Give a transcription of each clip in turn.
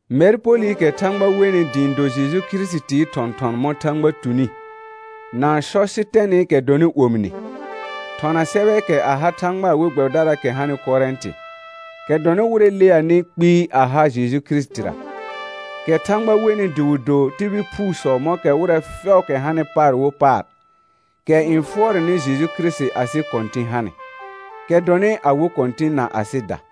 Mɛr Polɩkɛ Thãgba wenɩ dɩ ɩ̃ do Jeju Kirisitii thɔ̃thɔn mɔ̃ Thãgba tuni, na Sɔsɩtɛnɩkɛ dɔnɩ omine, thɔna sɛbɛɛkɛ a ha Thãgbaa we gbɛbɩdaraakɛ hanɩ Korɛ̃tɩ, kɛ dɔnɩ wɩrɛ leanɩ kpɩɩ a ha Jeju Kirisitira, kɛ Thãgba wenɩ dɩ wɩ do tibil phuusɔ mɔ̃kɛ wɩrɛ fɛʋʋkɛ hanɩ paar wo paar, kɛ n fʋɔrɛnɩ Jeju Kirisiti asɩ Kɔ̃tɩ̃ hanɩ, kɛ dɔnɩ awɩ Kɔ̃tɩ̃ na asɩda.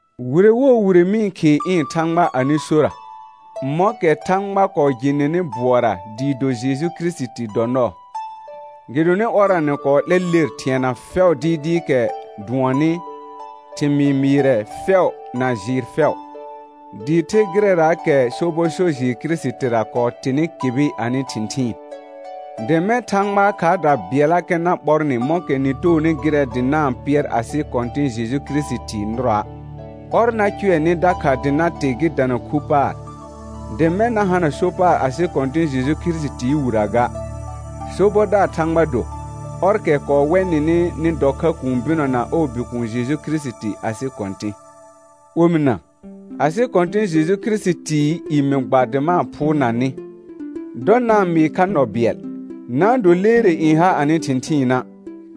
Wire wo wire mɩ-n khɩɩ ɩ̃ Thãgba anɩ sora, mɔ̃kɛ Thãgba kɔɔ jɩ nɩnɩ bʋɔra dɩɩ do Jeju Kirisiti dɔ nɔɔ. Gɩdonɩ ɔrra nɩ kɔɔ 'lɛ ler thɩɛna fɛʋ dɩɩdɩɩkɛ dʋɔnnɩ, thɩmɩɩ mɩɩrɛ fɛʋ na jɩɩr fɛʋ, dɩɩ the gɩrɛraakɛ sobɔ so jɩɩr Kirisitira kɔɔ tɩnɩ kɩbɩ anɩ thɩ̃thɩɩn; dɩ mɛ̃ Thãgbaa khaarda bɩɛllakɛ na ɓɔr nɩ mɔ̃kɛ nɩ toonɩ gɩrɛ dɩ na-n pɩɛr asɩ Kɔ̃tɩ̃ Jeju Kirisitii nɩrɔa'. Ɔr na cʋɛ nɩ dakha dɩ na tɩ gɩ dana khu paar, dɩ mɛ̃ na hana so paar asɩ Kɔ̃tɩ̃ Jeju Kirisitii wirə ga. Sobɔdaar Thãgba do, ɔrkɛ kɔɔ wɛ nɩnɩ nɩ dɔ kha kũu bɩnɔ na ɔɔ Bikuun Jeju Kirisiti asɩ Kɔ̃tɩ̃. Omɩna, asɩ Kɔ̃tɩ̃ Jeju Kirisitii i mɩ gba dɩ ma-n phʋʋrna nɩ, dɔ na-n mɩɩ kha nɔ bɩɛl, na-n do leere n ha anɩ thɩ̃thɩɩna',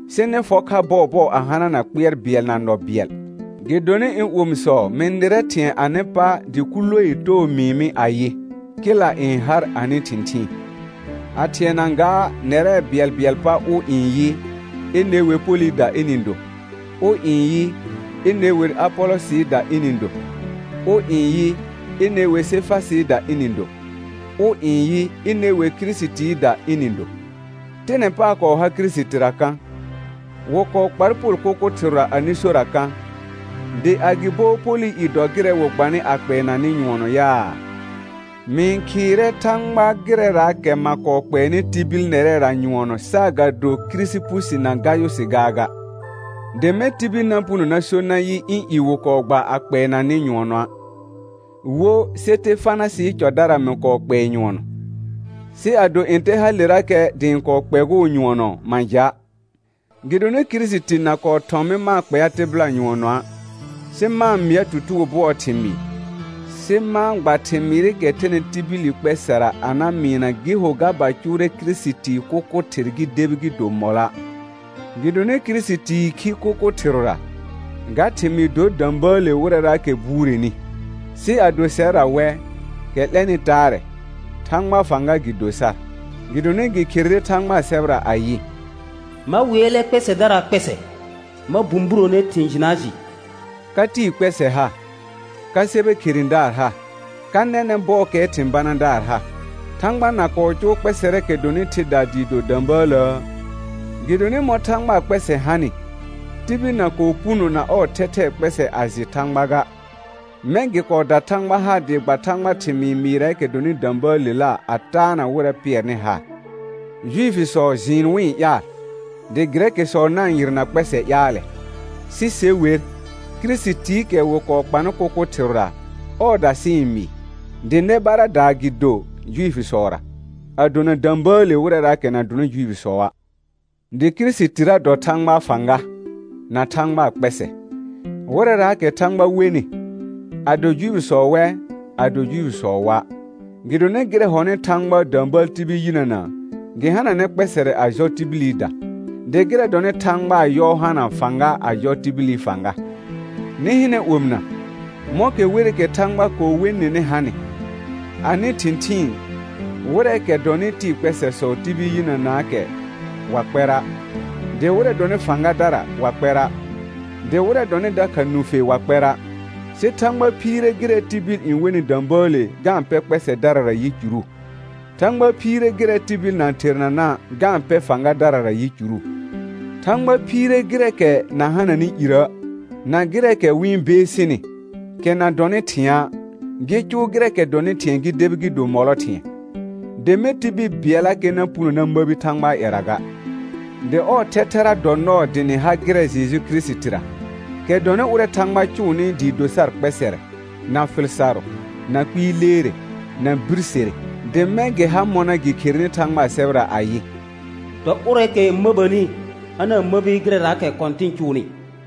sɩ nɩ fɔ kha bɔɔbɔɔ a hanana kpɩɛr bɩɛl na nɔ bɩɛl. Gɩdonɩ ɩ̃ omisɔ mɩ nɩrɛ thɩ̃ɛ anɩ pa dɩ Kʋloee too mɩɩ mɩ ayɩ, kɩla n har anɩ thɩ̃thɩɩn. A thɩɛna gaa nɛrɛ bɩɛlbɩɛlɩ pa ʋ n yɩ, ine wer Polɩda ɩnɩ do; ʋ n yɩ, ine wer Apolɔsɩɩda ɩnɩ do; ʋ n yɩ, ine wer Sefasɩɩda ɩnɩ do; ʋ n yɩ, ine wer Kirisitiida ɩnɩ do. Tɩnɛ paar kɔɔ har Kirisitira kã? Wɩ kɔɔ kpar Pol kʋkʋ thɩrʋra anɩ sora kã? Dɩ agɩbo Polɩ i dɔ gɩrɛ wɩ gbanɩ a kpɛɛna nɩ nyʋɔnɔ yaa? Mɩ-n khɩɩrɛ Thãgba gɩrɛraakɛ ma kɔɔ kpɛɛnɩ tibil nɛrɛra nyʋɔnɔ saagado Kirisipusi na Gayʋsɩ gaaga; dɩ mɛ̃ tibil na puno na so nayɩ ɩ̃ i wɩ kɔɔ gba a kpɛɛna nɩ nyʋɔnɔa'. Wo Sɩtefanasɩɩ cɔdara mɩ kɔɔ kpɛɛ nyʋɔnɔ, sɩ ado ntɛ halerakɛ dɩ ɩ̃ kɔɔ kpɛgʋʋ nyʋɔnɔ ma ja'. Gɩdonɩ Kirisiti na kɔɔ thɔ̃ mɩ ma-n kpɛa tɩbɩla nyʋɔnɔa', sɩ ma-n mɩa tutugo bʋɔɔ thɩmɩɩ, sɩ ma-n gba thɩmɩɩrɩkɛ thɛnɩ tibil kpɛsɛra a na mɩɩna gɩ ho ga ba cʋʋrɛ Kirisitii kʋkʋ thɩr gɩ debi gɩ do mɔlɔa'. Gɩdonɩ Kirisitii khi kʋkʋ thɩrʋra, ga thɩmɩɩ dor də̃bəəle wɩrɛraakɛ n buureni, sɩ ado sɛrra wɛ, kɛ 'lɛnɩ taarɛ, Thãgbaa fãga gɩ do sar. Gɩdonɩ gɩ kherere Thãgbaa sɛbɛra ayɩ: «Ma wɩɛlɛ kpɛsɛdaraa kpɛsɛ, ma bũburone thɩ̃ jɩnaa jɩ.» Ka tɩɩ kpɛsɛ ha? Ka sɛbɛ kheredaar ha? Ka nɛnɛ̃ bɔɔkɛɛ thɩ̃ banadaar ha? Thãgba na kɔɔ cʋʋ kpɛsɛrɛɛkɛ dɔnɩ thɩdaa dɩɩ do də̃bəələə? Gɩdonɩ mɔ̃ Thãgbaa kpɛsɛ hanɩ, tibil na kɔɔ puno na ɔɔ thɛthɛɛ kpɛsɛ a jɩ Thãgba ga, mɛ̃ gɩ kɔɔ da Thãgba haar dɩ gba Thãgbaa thɩmɩɩ mɩɩrɛɛkɛ dɔnɩ də̃bəəlela a taana wɩrɛ pɩɛrnɩ haar; Juifisɔ jɩɩn wɩ-n ƴaal, dɩ Gɩrɛkɩsɔ na-n yɩrna kpɛsɛ ƴaalɛ, sɩ se wer, Kirisitiikɛ wɩ kɔɔ kpanɩ kʋkʋ thɩrʋra, ɔɔda sɩ-n mɩɩ, dɩ nɛ baradaa gɩ do Juifisɔra, a dona də̃bəəle wɩrɛraakɛ na dɔnɩ Juifisɔa'; dɩ Kirisitira dɔ Thãgbaa fãga, na Thãgbaa kpɛsɛ, wɩrɛraakɛ Thãgba wenɩ, ado Juifisɔ wɛ, ado Juifisɔ wa'. Gɩdonɩ gɩrɛ hɔnɩ Thãgbaa də̃bəəl tibil yinəna, gɩ hananɛ kpɛsɛrɛ a jɔ tibilida, dɩ gɩrɛ hɔnɩ Thãgbaa yɔɔ hana fãga a jɔ tibili fãga. Nɩ hɩnɛ omɩna, mɔ̃kɛ werɩkɛ Thãgba kɔɔ we nɩnɩ hanɩ: Anɩ thɩ̃thɩɩn, wɩrɛɛkɛ dɔnɩ tɩɩ kpɛsɛsɔ tibil yinənaakɛ wa kpɛra', dɩ wɩrɛ dɔnɩ fãgadara wa kpɛra', dɩ wɩrɛ dɔnɩ dakha nũfe wa kpɛra'; sɩ Thãgba phiire gɩrɛ tibil n wenɩ də̃bəəle ga-n pɛ kpɛsɛdarara yicuru. Thãgba phɩire gɩrɛ tibil na-n thernana', ga-n pɛ fãgadarara yicuru; Thãgba phiire gɩrɛɛkɛ na hananɩ irə', na gɩrɛɛkɛ wɩ-n beesini, kɛ na dɔnɩ thɩ̃a', gɩ cʋʋ gɩrɛɛkɛ dɔnɩ thɩ̃ɛ gɩ debi gɩ do mɔlɔ thɩ̃ɛ, dɩ mɛ̃ tibil bɩɛllakɛ na puno na məbi Thãgbaa ƴɛra ga. Dɩ ɔɔ thɛthɛra dɔ nɔɔ dɩ nɩ ha gɩrɛ Jeju Kirisitira, kɛ dɔnɩ ʋrɛ Thãgba cʋʋnɩ dɩ do sar kpɛsɛrɛ, na fɩl sarʋ, na kpɩɩ leere, na birsere; dɩ mɛ̃ gɩ ha mɔna gɩ kherenɩ Thãgbaa sɛbɛra ayɩ: «Dɔ ʋrɛɛkɛ n məbəni, a na-n məbi gɩrɛraakɛ Kɔ̃tɩn cʋʋnɩ.»